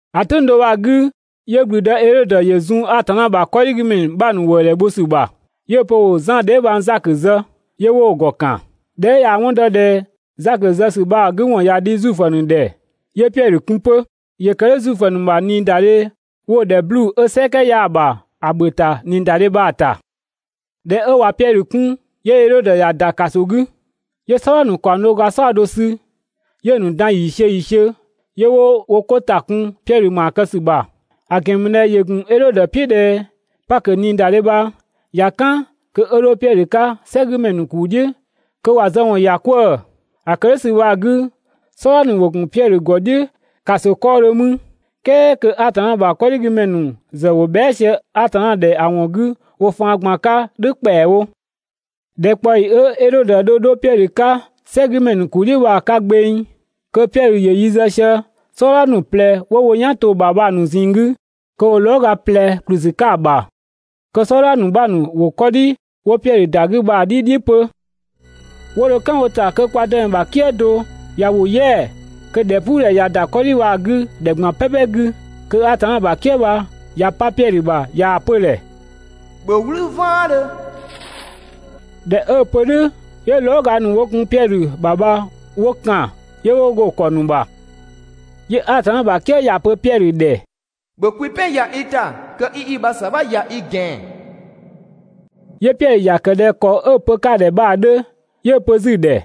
‑A "tʋ̈ng do bha‑ 'gü, 'yö ‑gblüdë Edhodö ‑yö zun Atanna ‑bha 'kɔdhigümɛ ‑nu 'bha ‑nu ‑wëëdhɛ bho ‑sü ‑bha, 'yö‑ pö ‑wo Zan dheebhang Zakö zë, 'yö 'wo‑ ‑gɔ ‑kan. ꞊Dhɛ 'ö ꞊yaa‑ 'wɔn dɔ ꞊dhɛ Zakö zë ‑sü bha‑ 'gü ‑wɔn ꞊ya dhi Zuifö ‑nu ‑dhɛ, 'yö Piɛdhö kun 'pö. (‑Yö ‑kë "dhʋ̈ Zuifö ‑nu ‑bha ꞊niidadhe 'wo‑ ‑dhɛ 'bluu‑ 'ö "sɛkɛ 'yaa‑ ‑bha ‑a ‑bhö ‑ta ꞊niidadhe bha‑ ‑ta.) ꞊Dhɛ 'ö ꞊wa Piɛdhö 'kun, 'yö Edhodö ‑ya ‑da ‑kaso 'gü, 'yö "sɔdha ‑nu ‑kaɔng do ga "saɔdo sü, 'yö‑ ‑nu dan ‑yiisiö ‑yiisiö, 'yö 'wo wo 'ko ‑ta kun Piɛdhö ‑maa kë ‑sü ‑bha, ‑a ‑gɛn ‑mü ꞊dhɛ ‑yö ‑gun Edhodö "piʋ̈ ꞊dhɛ Pakö ꞊niidadhe bha ꞊ya "kan, kö 'ö 'dho Piɛdhö 'ka "sɛgümɛ ‑nu ‑kuu "dhiʋ̈ kö ‑wa zë ‑wɔn ‑ya 'kwëë‑. ‑A ‑kë "dhʋ̈ ‑sü bha‑ 'gü "sɔdha ‑nu ‑wo ‑gun Piɛdhö ‑gɔ "dhiʋ̈ ‑kaso 'kɔɔdhö mü, "kɛɛ kö Atanna ‑bha 'kɔdhigümɛ ‑nu ‑zë ‑wo bhɛa" sië Atanna ‑dhɛ ‑a ‑wɔn 'gü wo faan ꞊gban 'ka "dhʋ̈ ‑kpɛawo. ‑Dhɛkpaɔyi 'ö Edhodö dho 'dho Piɛdhö 'ka "sɛgümɛ ‑nu ‑kuu "dhiʋ̈‑ 'ka bha‑ 'ka gbeng, kö Piɛdhö ‑yö yi zë sië "sɔdha ‑nu ꞊plɛ 'wo wo "yan to‑ ‑bha bha‑ ‑nu ꞊zinng 'gü, kö ‑wo lɔɔga ꞊plɛ ‑kplü ‑sü 'ka‑ ‑bha, kö "sɔdha 'bha ‑nu ‑wo 'kɔdhi 'wo Piɛdhö ‑da 'gü bha‑ "dhi "dhiʋ̈ 'pö. 'Wo dho "kan wo ‑ta kö kwa Dëmɛ ‑bha "kië do ꞊ya ‑wo "yɛa‑, kö ‑dhɛpuudhɛ ‑ya ‑da 'kɔdhi bha‑ 'gü ‑dhɛ ꞊gban "pɛpɛ 'gü, kö Atanna ‑bha "kië bha ꞊ya 'pa Piɛdhö ‑bha ꞊yaa‑ pö‑ ‑dhɛ: «‑Bhö "wlü "vaandhö!» ꞊Dhɛ 'ö‑ pö "dhʋ̈, 'yö lɔɔga ‑nu 'wo gun Piɛdhö ‑bha bha 'wo ‑kan, 'yö 'wo go‑ ‑kɔ ‑nu ‑bha. 'Yö Atanna ‑bha "kië ‑ya pö Piɛdhö ‑dhɛ: «‑Bhö kwi "pɛn ‑ya i ‑ta kö 'i i ‑bha ‑sabha ‑ya i ‑gɛan!» 'Yö Piɛdhö ‑ya ‑kë ꞊dhɛ ‑kɔ 'ö‑ pö‑ 'ka‑ ‑dhɛ bha‑ 'dhö. 'Yö‑ pö 'zü‑ ‑dhɛ: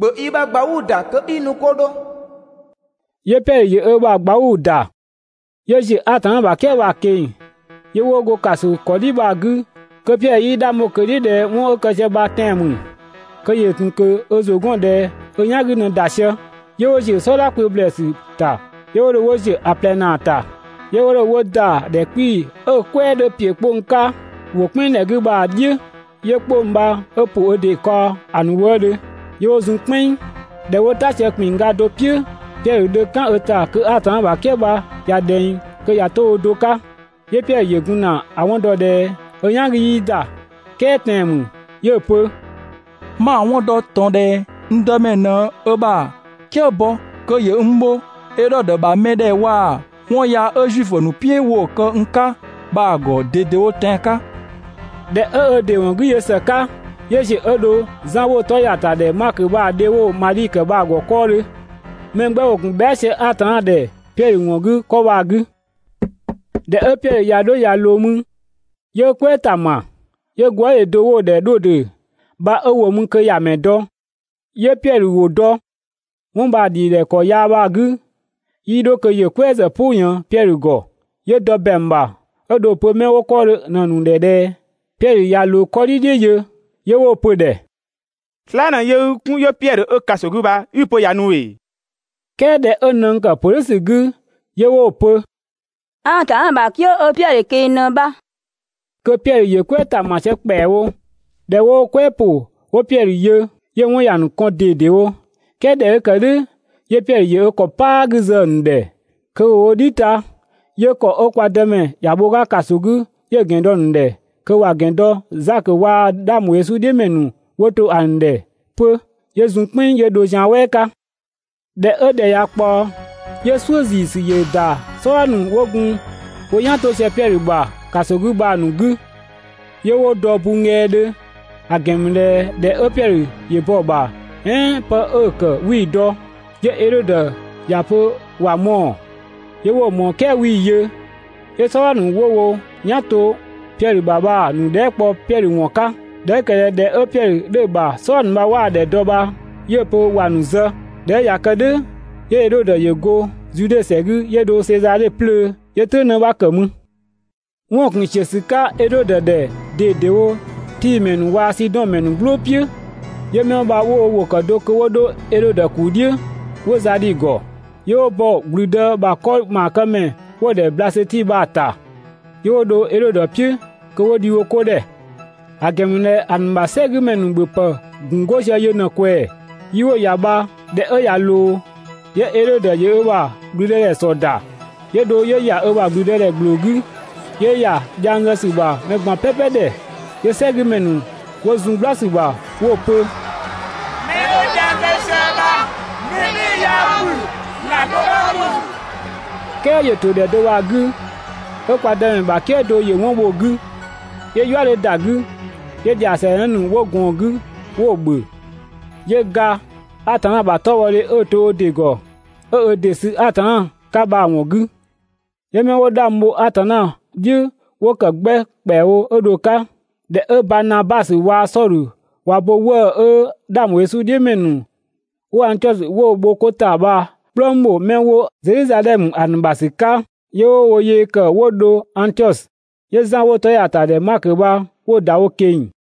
«‑Bhö i ‑bha ꞊gbauu ‑da kö 'i nu 'ko 'dho!» 'Yö Piɛdhö ‑yö ö ‑bha ꞊gbauu‑ ‑da, 'yö ‑ziö Atanna ‑bha "kië bha‑ ꞊keng‑, 'yö 'wo go ‑kaso ‑kɔdhi bha‑ 'gü kö Piɛdhö 'yii 'dhang bho ꞊kö‑ "dhiʋ̈ ꞊dhɛ 'wɔn 'ö kë sië bha tɛan‑ ‑mü. Kö ‑yö ‑tun ꞊kö ö ‑zʋ 'gɔn ꞊dhɛ ö "yan 'gü ꞊në ‑da sië, 'yö 'wo ‑ziö "sɔdha kpö ‑blɛɛsü ‑ta, 'yö 'wo dho 'wo ‑ziö ‑a ꞊plɛ ‑naa ‑ta, 'yö 'wo dho 'wo ‑wo ‑da ‑dhɛ 'kpii‑ 'ö‑ "kwɛɛ 'dhö ‑piö 'kpong 'ka ‑wo "kpɛnng ‑dhɛ 'gü bha‑ "dhiʋ̈, 'yö 'kpong bha 'ö ‑pʋ ö ‑dɩ kaɔ ‑a ‑nu wëëdhö, 'yö 'wo zun "kpɛnng. ꞊Dhɛ 'wo "ta sië ‑kpinngga do "piʋ̈, Piɛdhö dho "kan ö ‑ta kö Atanna ‑bha "kië bha ꞊ya ꞊dhɛng kö ꞊ya 'to ö do 'ka. 'Yö Piɛdhö ‑yö gun ‑na ‑a 'wɔn dɔ ꞊dhɛ 'ö "yan 'gü 'yii ‑da, "kɛɛ tɛan‑ ‑mü. 'Yö‑ pö: «'Ma‑ 'wɔn dɔ ꞊tɔn ꞊dhɛ n Dëmɛ ꞊në ö ‑bha "kië bɔ kö ‑yö n bho Edhodö ‑bha mɛ ‑dhɛ waa‑ 'wɔn yaa 'ö Zuifö ‑nu "piʋ̈ 'wo‑ kë n 'ka bha‑ ‑gɔ ꞊dedewo tɛan‑ 'ka!» ꞊Dhɛ 'ö ö ‑dɩ ‑wɔn 'gü yö ‑së 'ka, 'yö ‑ziö 'ö dho Zan 'wo‑ 'tɔ ‑ya ‑ta ‑dhɛ Makö bha‑ dhe 'wo‑ ‑dhɛ Madhi bha‑ ‑gɔ 'kɔɔdhö. Mɛ 'gbɛ ‑wo ‑gun bhɛa" sië Atanna ‑dhɛ Piɛdhö ‑wɔn 'gü 'kɔ bha‑ 'gü. ꞊Dhɛ 'ö Piɛdhö ꞊ya 'dho ꞊ya ꞊loo mü, 'yö "kwɛɛ ‑ta ‑ma, 'yö gwëëdhe do 'wo‑ ‑dhɛ Dhodë bha 'ö ‑wo mü kö ‑ya ‑mɛ dɔ. 'Yö Piɛdhö ‑wʋ dɔ. 'Wɔn bha‑ ‑dhidhɛ ‑kɔ yaa bha‑ 'gü, 'yii 'dho kö ‑yö "kwɛɛ ‑zë "pʋ ꞊yën Piɛdhö ‑gɔ, 'yö dɔ ‑bɛang ‑bha 'ö dho‑ pö 'mɛ 'wo 'kɔɔdhö ꞊në‑ ‑nu ‑dhɛ ꞊dhɛ: «Piɛdhö ꞊ya ꞊loo 'kɔdhi "dhiʋ̈ yö!» 'Yö 'wo‑ pö‑ ‑dhɛ: «Slaa" ꞊në yöö i 'kun 'yö Piɛdhö 'ö ‑kaso 'gü bha 'i‑ pö ꞊ya nu ‑ee?» "Kɛɛ ꞊dhɛ 'ö nëng ‑kë ‑pö "dhʋ̈ ‑sü 'gü 'yö 'wo‑ pö: «Atanna ‑bha "kië 'ö Piɛdhö ꞊keng‑ ꞊në bha. Kö Piɛdhö ‑yö "kwɛɛ ‑ta ‑ma sië ‑kpɛawo. ꞊Dhɛ 'wo "kwɛɛ ‑pʋ 'wo Piɛdhö yö, 'yö‑ 'wɔn ‑ya ‑nu kɔn ꞊dedewo. "Kɛɛ ꞊dhɛ 'ö ‑kë "dhʋ̈, 'yö Piɛdhö ‑yö ö ‑kɔ "paa 'gü zë‑ ‑nu ‑dhɛ kö ‑wo wo "dhi ta, 'yö ‑kɔ 'ö kwa Dëmɛ ‑ya bho‑ 'ka ‑kaso 'gü 'yö‑ ‑gɛn dɔ‑ ‑nu ‑dhɛ kö ‑wa ‑gɛn dɔ Zakö waa‑ 'dhang ‑bho Yesu "dhiʋ̈ ‑mɛ ‑nu 'wo to ‑a ‑nu ‑dhɛ 'pö, 'yö zun "kpɛnng 'yö dho zian "wɛɛ 'ka. ꞊Dhɛ 'ö ‑dhɛ ꞊ya kpaɔ, 'yö "suʋ̈ ‑ziisü ‑yö ‑da "sɔdha ‑nu 'wo gun wo "yan 'to sië Piɛdhö ‑bha ‑kaso 'gü bha‑ ‑nu 'gü, 'yö 'wo dɔ bunnggɛɛdhö; ‑a ‑gɛn ‑mü ꞊dhɛ ‑dhɛ 'ö Piɛdhö ‑yö bɔ‑ ‑bha "ɛɛn 'pë 'ö‑ ‑kë 'wii‑ dɔ. 'Yö Edhodö ‑ya pö ‑wa mɔɔ‑, 'yö 'wo‑ ꞊mɔɔ "kɛɛ 'wii‑ yö. 'Yö "sɔdha ‑nu 'wo wo "yan to Piɛdhö ‑bha bha‑ ‑nu dhɛɛ" kpɔ Piɛdhö ‑wɔn 'ka. ꞊Dhɛ 'ö ‑kë ꞊dhɛ ‑dhɛ 'ö Piɛdhö 'dhö‑ ‑bha "sɔdha ‑nu bha 'waa‑ ‑dhɛ dɔ bha 'yö‑ pö ‑wa ‑nu zë. ꞊Dhɛ 'ö ꞊ya kë "dhʋ̈, 'yö Edhodö ‑yö go Zude ‑sɛ 'gü 'yö dho Sezadhe 'plöö, 'yö "tʋ̈ng 'në 'bha ‑kë mü. 'Wɔn‑ ‑gun ‑siö ‑sü 'ka Edhodö ‑dhɛ ꞊dedewo Tii ‑mɛ ‑nu waa‑ Sidɔn ‑mɛ ‑nu "glʋʋ "piʋ̈. 'Yö 'mɛ 'wo bha 'wo wo ‑wʋ ‑kë do kö 'wo 'dho Edhodö ‑kuu "dhiʋ̈ 'wo za dhi‑ ‑gɔ, 'yö 'wo bɔ ‑gblüdë ‑bha 'kɔ ‑maakëmɛ 'wo‑ ‑dhɛ Blasöti bha‑ ‑ta, 'yö 'wo dho Edhodö "piʋ̈ kö 'wo dhi wo 'ko ‑dhɛ, ‑a ‑gɛn ‑mü ꞊dhɛ ‑a ‑nu ‑bha "sɛgümɛ ‑nu ‑bhöpë ‑gun 'go sië yö ꞊në‑ ꞊kwɛɛ‑. Yi 'wo‑ ‑ya bha ꞊dhɛ 'ö ꞊ya ꞊loo, 'yö Edhodö ‑yö ö ‑bha ‑gblüdëdhɛ ‑sɔ ‑da, 'yö dho 'yö ‑ya ö ‑bha ‑blüdëdhɛ ‑gbloo 'gü, 'yö ‑ya dhiang zë ‑sü ‑bha mɛ ꞊gban "pɛpɛ ‑dhɛ. 'Yö "sɛgümɛ ‑nu 'wo zun "gbla ‑sü ‑bha 'wo‑ pö: «'Mɛ 'ö dhiang zë sië bha mɛ "bhɩɩ‑ 'yaa ‑mü, ‑zlan do 'bha ‑mü!» "Kɛɛ ‑yö ‑to ‑dhɛ do bha‑ 'gü, 'ö kwa Dëmɛ ‑bha "kië do ‑yö 'wɔn bho‑ 'gü, 'yö "yua 'dhö ‑da 'gü, 'yö ‑dhiasɛɛ 'në ‑yö ꞊gɔɔn‑ 'gü 'yö‑ ‑bhö, 'yö ga Atanna ‑bha 'tɔbhɔdhe 'ö‑ to ö ‑dɩ ‑gɔ ('ö ö ‑dɩ sü Atanna 'ka bha‑ ‑wɔn 'gü.) 'Yö 'mɛ 'wo 'dhang bho Atanna "dhiʋ̈ 'wo ‑kë 'gbɛ ‑kpɛawo 'ö dho‑ 'ka. ꞊Dhɛ 'ö Banabasö waa‑ Sɔdhö ꞊wa bo ('wëë‑ 'ö 'dhang ‑bho Yesu "dhiʋ̈ ‑mɛ ‑nu 'wo Angtiɔsö 'wo‑ bho 'ko ‑ta bha‑ "kplëng ‑bho 'mɛ 'wo Zedhizadhɛmö ‑a ‑nu ‑bha ‑sü 'ka), 'yö 'wo wo yee ‑kë 'wo dho Angtiɔsö. 'Yö Zan 'wo‑ 'tɔ ‑ya ‑ta ‑dhɛ Makö bha 'wo‑ ‑da wo ꞊keng‑.